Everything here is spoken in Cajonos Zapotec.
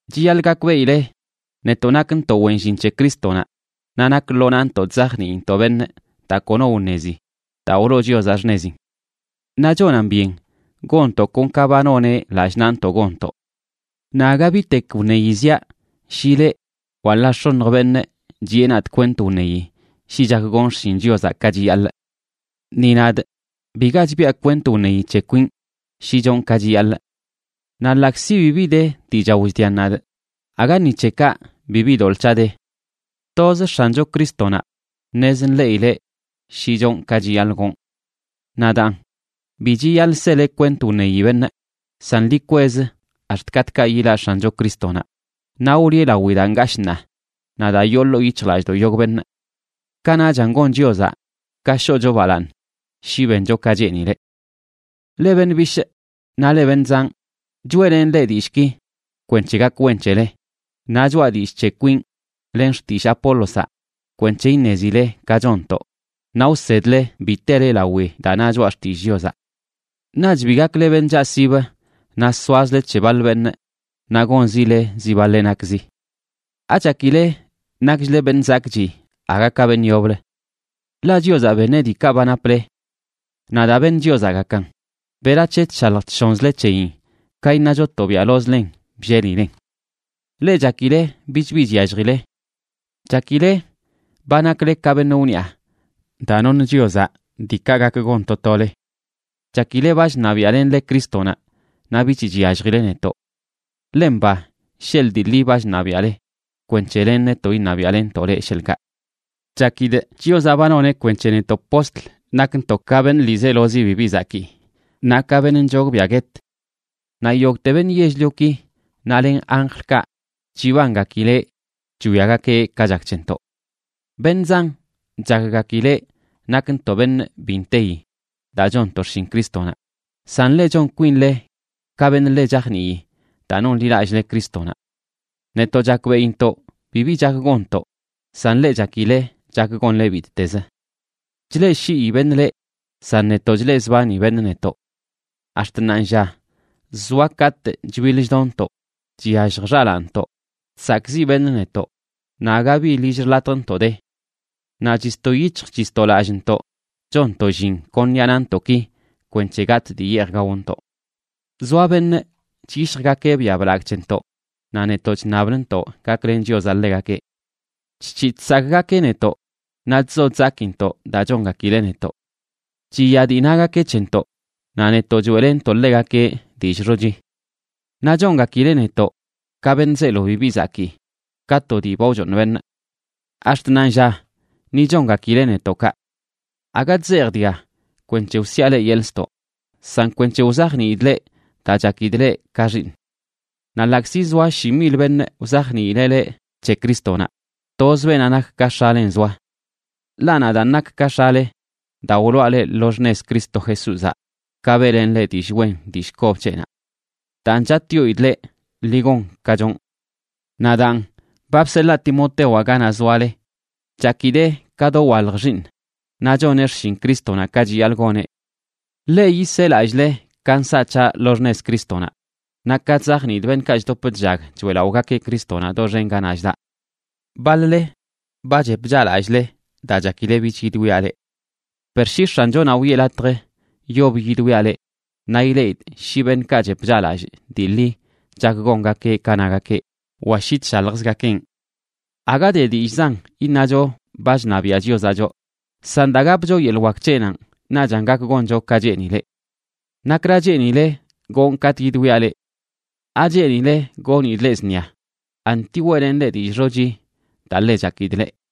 Chiyaḻꞌ gakbeꞌile netoꞌ nakntoꞌ wen llin c̱he Crístonaꞌ, naꞌ nak lo naꞌntoꞌ chzajniintoꞌ beṉꞌ daa kono wṉezi daa wloo Chiozaꞌ xṉezin. Naꞌ chonan byen gonntoꞌ kon ka ba noneꞌ lallꞌ naꞌntoꞌ gonntoꞌ. Naꞌ aga bitek wṉeyi ziaꞌ shi leꞌ wa ḻaa x̱oṉj beṉꞌ chiꞌe nadꞌ kwent wṉeyi shi chak gonꞌ xshin Chiozaꞌ ka chiyaḻꞌ. Ni nadꞌ biga chbiꞌa kwent wṉeyi c̱he kwinꞌ shi chonꞌ ka chiyaḻꞌ. Naꞌ ḻaꞌkzi bibi de dii chao chdian nadꞌ, aga ni c̱he kaꞌ bibi doḻꞌ c̱haꞌ de. Toz X̱ancho Crístonaꞌ ṉez nḻeꞌileꞌ shi chonꞌ ka chiyaḻꞌ gonꞌ. Naꞌ daan, bi chiyaḻꞌ sele kwent wṉeyi beṉꞌ, san ḻi kwez ax̱t katꞌkaꞌ yilaꞌ X̱ancho Crístonaꞌ naꞌ wliꞌe lawi daa ngashꞌ ṉaa naꞌ daa yoo ḻoo yic̱hjlallꞌdoꞌ yogꞌ beṉꞌ. Kanaꞌchan gon Chiozaꞌ ka shoꞌcho balaaṉ shi bencho ka cheenileꞌ. Leꞌ beṉꞌ bishꞌ naꞌ leꞌ beṉꞌ zanꞌ, choeꞌlenꞌ leꞌ dillꞌki kwenc̱he gak wen c̱hele, naꞌ choꞌa dillꞌ c̱he kwinꞌ len xtillꞌ Apólozaꞌ kwenc̱he iṉezile ka chonntoꞌ naꞌ wsedle bi tele lawi daa na Choꞌa Xtillꞌ Chiozaꞌ. Naꞌch bi gakle beṉꞌ chaꞌsib naꞌ soazle c̱he baḻ beṉꞌ naꞌ gonzile zi baḻeꞌ nakzi. ¿Achakile nakchle beṉꞌ zakꞌchi aga ka beṉꞌ yoblə? Ḻaꞌ Chiozaꞌ beṉeꞌ diikaꞌ ba naple. Naꞌ daa beṉ Chiozaꞌgakan, ¿berac̱he chshalj chshonzle c̱heyin ka iṉacho tobiaꞌlozlen bllelilen? Leꞌ chakile bich bi chyalljile. Chakile ba nakle ka beṉꞌ wniꞌa daa noṉ Chiozaꞌ diikaꞌ gak gon to tole. Chakile ba chṉabiaꞌlenle Crístonaꞌ naꞌ bich chyalljile netoꞌ. Ḻe mba sheḻꞌ dii ḻi ba chṉabiaꞌle, kwenc̱he len netoꞌ iṉabiaꞌlenntoꞌ leꞌ, sheḻꞌkaꞌ. Chakidꞌ Chiozaꞌ ba noneꞌ kwenc̱he netoꞌ postl nakntoꞌ ka beṉꞌ ḻiizelozi bibi zakii, naꞌ ka beṉꞌ nchogbiaꞌ guet. Naꞌ yogꞌte beṉꞌ yell-lioki naꞌ len anjlkaꞌ chibangakileꞌ chwiagakeꞌ ka chak c̱hentoꞌ. Beṉꞌ zan chakgakileꞌ nakntoꞌ beṉꞌ bi nteyi daa chonntoꞌ xshin Crístonaꞌ, san leꞌ, chon kwinle ka beṉꞌ ḻe chajnii daa nonḻilallꞌle Crístonaꞌ. Netoꞌ chakbeꞌintoꞌ bibi chak gonntoꞌ, san leꞌ chakile chak gonle bittezə. Chleꞌshii beṉꞌ leꞌ, san netoꞌ, chleꞌzbani beṉꞌ netoꞌ. Ax̱t ṉaanlla zoa katꞌ chbiḻ chdonntoꞌ, chyallj xalaanntoꞌ, chsakꞌziꞌ beṉꞌ netoꞌ, naꞌ aga bi lill xḻatjntoꞌ de. Naꞌ chisto yic̱hj chisto lallꞌntoꞌ chonntoꞌ llin kon ṉiꞌa naꞌntoꞌki kwenc̱he gatꞌ dii yeej gaontoꞌ. Zoa beṉꞌ chyishjgakeꞌ biaꞌ blagꞌ c̱hentoꞌ, naꞌ netoꞌ chṉablntoꞌ gaklen Chiozaꞌ ḻegakeꞌ. Chc̱hi chsakꞌgakeꞌ netoꞌ naꞌ chzo chzakintoꞌ daa chongakileꞌ netoꞌ. Chiya dii nagakeꞌ c̱hentoꞌ, naꞌ netoꞌ choeꞌlentoꞌ ḻegakeꞌ dillꞌ xochi. Naꞌ chongakileꞌ netoꞌ ka beṉꞌ zeelo bibi zakii, ka to dii ba wchooṉ beṉꞌ. Ax̱t ṉaanlla ni chongakileꞌ netoꞌ kaꞌ. Aga chzejꞌ dga kwenc̱he wsiꞌa leꞌ yeḻꞌ ztoꞌ, san kwenc̱he wzajniidꞌ leꞌ, daa chakidꞌ leꞌ ka xiiṉꞌ. Naꞌ ḻaꞌkzi zoa shi mil beṉꞌ wzajniileꞌ leꞌ c̱he Crístonaꞌ, toz beenaꞌ nak ka x̱alen zoa. Ḻaꞌ nadaan nakꞌ ka x̱ale daa wloꞌa leꞌ lo xṉez Cristo Jesúzaꞌ ka beꞌlenꞌ leꞌ dillꞌ wen dillꞌ kob c̱heꞌnaꞌ. Daan chatꞌyoidꞌ leꞌ, ḻi gon ka chonꞌ. Naꞌ daan, ba bseḻaa Timotewaꞌ ganaꞌ zoale. Chakidee ka dowalj xiiṉꞌ naꞌ choneꞌ xshin Crístonaꞌ ka chiyaḻꞌ goneꞌ. Ḻeꞌ yisee lallꞌle ka nsaꞌ c̱haꞌ lo xṉez Crístonaꞌ, naꞌ ka chzajniidꞌ beṉꞌkaꞌ chdop chllag choeꞌlaꞌogakeꞌ Crístonaꞌ doxen ganaꞌ chdaꞌ. Baḻ-le ba chep chaꞌlallꞌle daa chakileꞌ bich yidwiaꞌ leꞌ. Per shi X̱anchonaꞌ wiꞌe latj, yob yidwiaꞌ leꞌ naꞌ ileꞌidꞌ shi beṉꞌkaꞌ chep chaꞌlallꞌ dii ḻi chak gongakeꞌ ka nagakeꞌ wa shi chshaljzgakenꞌ. Aga de dillꞌzan iṉacho ba chṉabiaꞌ Chiozaꞌ choꞌ, san daa gapcho yeḻꞌ wak c̱heꞌnanꞌ naꞌchan gak goncho ka cheenileꞌ. ¿Nakra cheenile gonꞌ katꞌ yidwiaꞌ leꞌ? ¿Acheenile gonidꞌ leꞌ zṉia?, anti ¿weꞌlenꞌ leꞌ dillꞌ xochi daa ḻe chakidꞌ leꞌ?